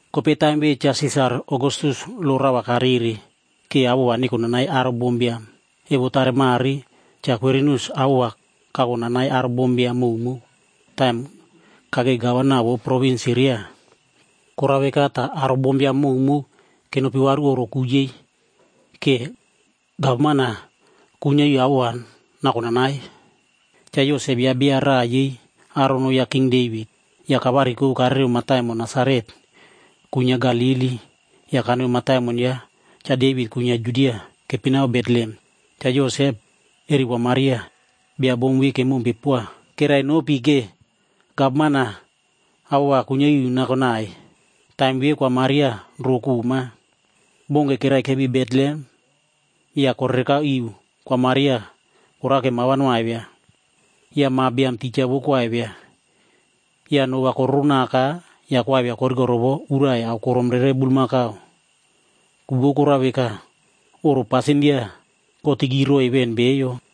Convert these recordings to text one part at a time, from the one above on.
Kopei taim ve Cha Sisar Ogastus lo raꞌa va karere ke awoꞌo va nekonanai aro bombiam. Evo tare mare Cha Kwirinius awoꞌo va kakonanai aro bombiam mowmow taim kakei gavana vou provins Siria.a Korao veka ta aro bombiam mowmow kenopi varu oꞌro ku yei, ke gavman-a kuinyia iu awoꞌo va nakonanai. Cha Yosep yaꞌa bia raꞌa yei aro noꞌo ya King Devit. Ya kavariko karereo mataimon Nasaret kuinyia Galili ya kanoi mataimon ya Cha Devit kuinyia Judia, keipinao Betlehem. Cha Yosep eri Kwa Maria, bia bom ve kemompe poa, kerainopi ke gavman-a awoꞌo va kuinyia iu nakonai. Taim ve Kwa Maria ro koꞌma. Bounke keraikepi Betlehem ya korereka iu Kwa Maria korake ma va noaivia. Ya ma biam tija vou koaivia. Ya no va kororonaka ya koaivia korikorovo urai aokorom rere bulmakau. Ku vou korao veka, oꞌro pasindia kotiki roiy ven beiyo.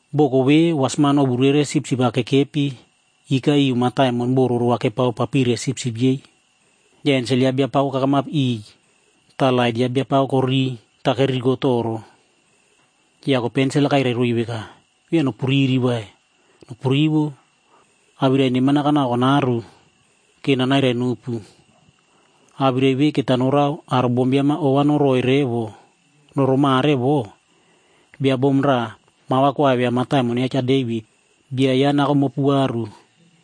Boko vere, wasman ovu rere sipsip-ab kekepi ika iu mataimon boꞌo roro va kepaoparire sipsip yei. Ya ensel ya Biapako kakamap iꞌiy ta lait ya Biapako koririy ta keriritoro. Ya kopei ensel-a kairai roiy veka, “Via nopuriri vai. Nopurivo. Awirai neman-a kanako kanaro ke nanairai nopu. Awirai ve keta norao aro bombiam-a ova noroꞌoi revo. Roro mare vo, bia bom raꞌa ma va koaivia mataimon ya Cha Devit. Bia ya nako mopu varu.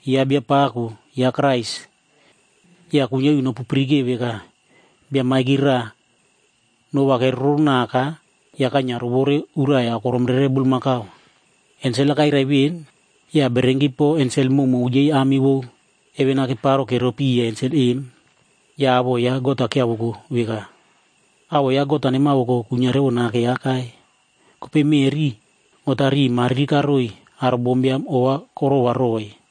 Yaꞌa Biapako, Ya kuinyia iu nopupirikeo veka, bia maiki raꞌa no va keroronaka ya kainyia rovore urai aokorom rere bulmakau.” Ensel-a kairai ven, ya bererenki po ensel mowmow yei ami vou heven-a keparo keropi piya ensel em. Ya awoꞌo ya God-a kyiavoko veka, “Awoꞌo ya God-a nemavoko kuinyia revo nake akai. Kopei meꞌri, God-a riꞌi mariri karoiy aro bombiam ova korova roiy.”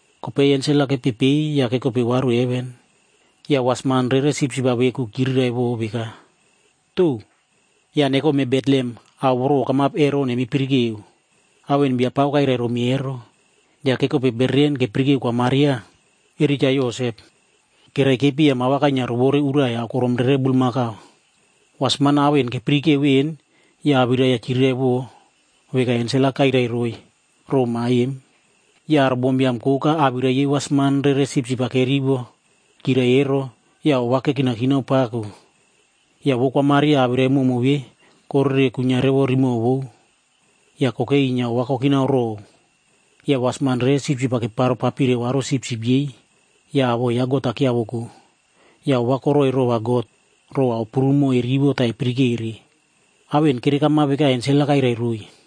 Kopei ensel-a kepepei ya kekope varu heven. Ya wasman rere sipsip-a veku chiriraivo veka, “To! Ya nekome Betlehem ao voro okamap ero nemipirikeo. Ao en Biapako kairai romi ero.” Ya kekope bereren kepirikeo Kwa Maria eri Cha Yosep. Keraikepi ya ma va kainyia rovore urai aokorom rere bulmakau. Wasman-a ao en kepirikeo ven ya awirai-ya chiriraivo veka ensel-a kairai roiy row ma em. Ya aro bombiam koka awirai yei wasman rere sipsip-a kerivo kyirai ero ya ova kekinakinao pako. Ya vou Kwa Maria awirai mowmow ve korere kuinyia revo rimoꞌo vou, ya kokei inyia ova kokinao row. Ya wasman rere sipsip-a keparopapire varu sipsip yei ya awoꞌo ya God-a kyiavoko. Ya ova koroꞌoi rova God row ao prumo erivo ta epirikere. Ao en kerekamap veka ensel-a kairai roiy.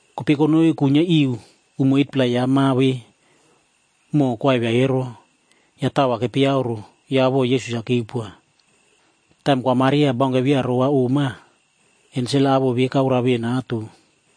Kopei konoi kuinyia iu umo 8-pla ya ma ve moꞌo koaivia ero, ya tao va kepeyauro ya awoꞌo keipinaka Yesus. Taim Kwa Maria baunke via ro va oꞌma, ensel-a awoꞌo ve kaoroa ven ato.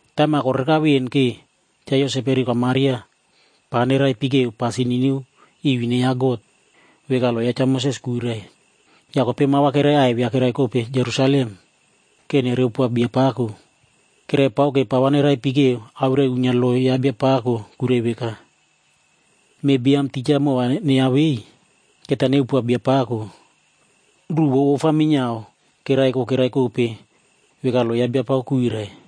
Taim-a korereka ven ke Cha Yosep eri Kwa Maria pa neraipikeo pasin niniu iu ine ya God, veka lo ya Cha Moses kuirai. Ya kopei ma va keraiaivia keraikope Jerusalemd ke nereupoa Biapako. Keraipake pa va neraipikeo awirai uinyia lo ya Biapako kuirai veka, “Meꞌe biam tija moꞌo va neyavei, keta neupoa Biapako.” Ruꞌu vou ofa minyiao keraiko keraikope veka lo ya Biapako kuirai.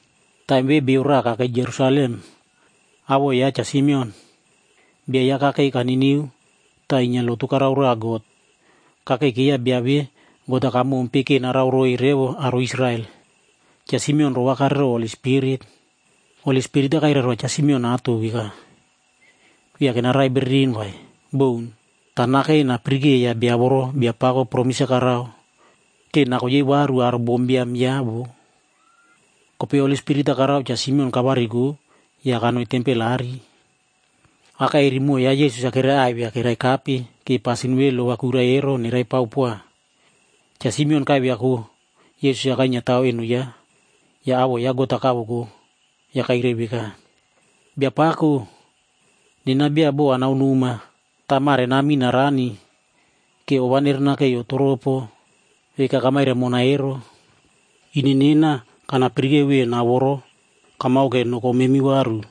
Taim ve bio raꞌa kakei Jerusalem, awoꞌo yaꞌa Cha Simeon. Bia yaꞌa kakei kaniniu ta inyia lotu karao roa God. Kakeikeiya bia ve God-a kamompe ke narao roiy revo aro Israel. Cha Simeon rovakare row Holi Spirit. Holi Spirit-a kairai roa Cha Simeon ato veka, viake narai bereren vai. Boun. Ta nakei napirikeiya bia voro Biapako promis-a karao ke nako yei varu aro bombiam yaꞌa voꞌo. Kopei Holi Spirit-a karao Cha Simeon kavariko ya kanoi tempel aꞌari. Aka eri moꞌo ya Yesus-a keraiaivia keraikape ke pasin ve lo va kuirai ero nerepao poa. Cha Simeon kaiviako Yesus kainyiatao eno yaꞌa, ya awoꞌo ya God-a kavoko ya kairai veka, “Biapako, nena bia bo anao noma ta mare namin narani, ke ova nerenakeiyo toropo, veka kamairai mona ero. Ine nena kanapirikeo ven ao voro kamao ke noko memi varu.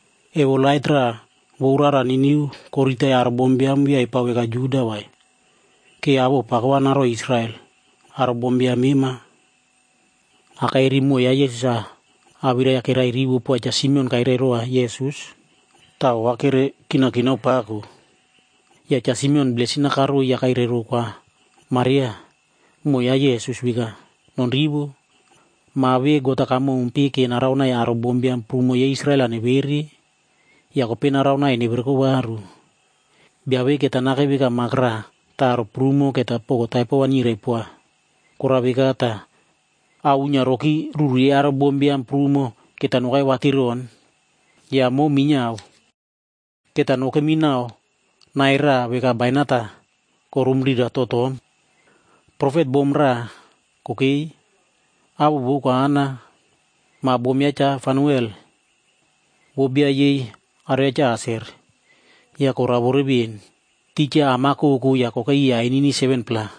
Emo lait raꞌa vou rara niniu koriritai aro bombiam via epao veka Juda vai, ke awoꞌo pako va naroiy Israel, aro bombiam mema.” Aka eri moꞌo ya Yesus-a awirai-ya kerairivo poa Cha Simeon kairai rova Yesus, ta ova kerekinakinao pako. Ya Cha Simeon blesin-a karoiy ya kairai row Kwa Maria, moꞌo ya Yesus veka, “Nonrivo. Ma ve God-a kamompe ke naraonai aro bombiam prumo yei Israel-a nevere, ya kopei naraonai nevereko varu. Bia ve keta nakei veka mak raꞌa ta aro prumo keta poko taipo va nyirai poa. Korao veka ta ao uinyia roki ruru yei aro bombiam prumo, keta nokai vatiron. Ya momu minyiao keta nokemi nau nai raꞌa veka bainat-a koromurira totom.” Profet bom-a raꞌa kokei, awoꞌo vou Kwa Ana. Ma bom ya Cha Fanuel, vou bia yei aro ya Cha Aser. Ya koraovore ven. Tija am-a koko ya kokei iya ainini 7-pla.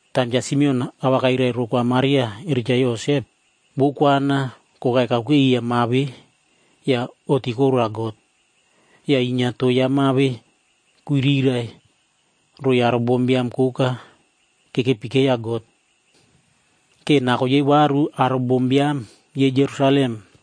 Taim Cha Simeon awirai-ya kairai row Kwa Maria eri Cha Yosep, vou Kwa Ana kokai kakuke iya ma ve ya oꞌti koroa God. Ya inyia to ya ma ve kuirirai roiy aro bombiam koka kekepikeiya God, ke nakoi yei varu aro bombiam yei Jerusalem.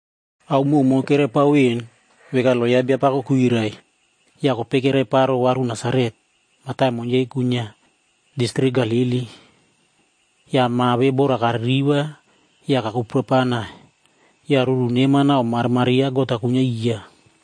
Ao mowmow keraipao ven veka lo ya Biapako kuirai, ya kopei keraiparo varu Nasaretf mataimon yei kuinyia distrik Galili. Ya ma ve bora kaririva ya kakuprapana. Ya ruru neman nau marimari ya God-a kuinyia iya.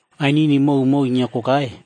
Ainini mowmow inyia kokai,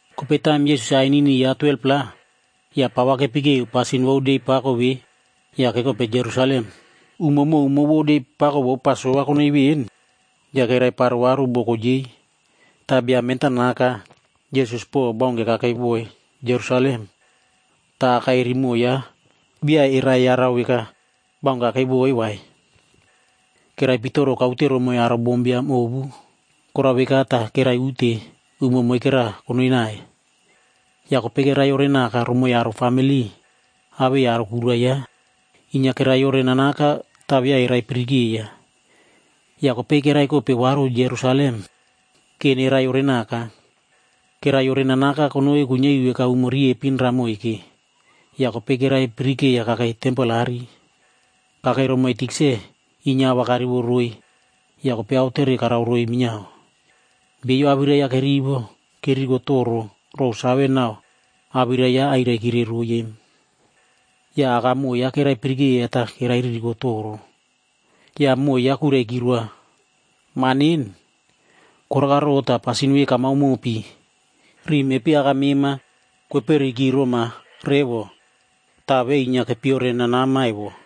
Kopei taim Yesus-a ainini ya 12-pla, ya pa va kepikeo pasin vou de pako ve ya kekope Jerusalem. Umo mowmow vou de pako vou Pasova konoi ven, ya keraiparo varu boko yei. Ta bia mentanaka Yesus po baunke kakeiwoiy Jerusalem. Ta aka eri moꞌo yaꞌa via eraiyarau veka baunke kakeiwoiy vai. Keraipitoro kaute romoiy aro bombiam ovu. Korao veka ta keraiute umo moikera konoinai. Ya kopei keraiyorenaka romoiy aro famili awei aro kura yei. Inyia keraiyorenanaka ta via eraipirikeiya. Ya kopei keraikope varu Jerusalem ke neraiyorenaka. Keraiyorenanaka konoi kuinyia iu veka umo riepin raꞌa moike, ya kopei keraipirikeiya kakei tempel aꞌari. Kakei romoiy tikse inyia a va karivo roiy ya kopei aotere karao roiy minyiao. Beiyo awirai yaꞌa kerivo, keririkotoro row save nau awirai yaꞌa airaikire roiy em. Ya akamoꞌo yaꞌa keraipirikeiya ta kerairirikotoro. Ya moꞌo yaꞌa kuiraiki roa, “Ma nen, koraka ro ta pasin ve kamao mopi? Riꞌi mepi aka mema kweperukiroma revo ta ve inyia kepiyorenanama evo.”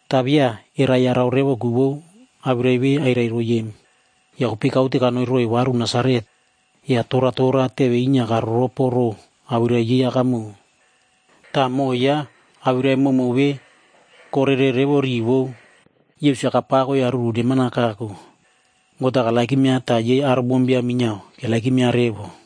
Ta via eraiyarau revo ku vou awirai ve airai roiy em. Ya kopei kaute kanoi roiy varu Nasaret. Ya toratora teve inyia karoropo row awirai yei akamoꞌo. Ta moꞌo yaꞌa awirai mowmow ve korere revo riꞌi vou. Yesus-a kapako ya ruru neman-a kako. God-a karererova ta yei aro bombiam minyiao keperepova revo.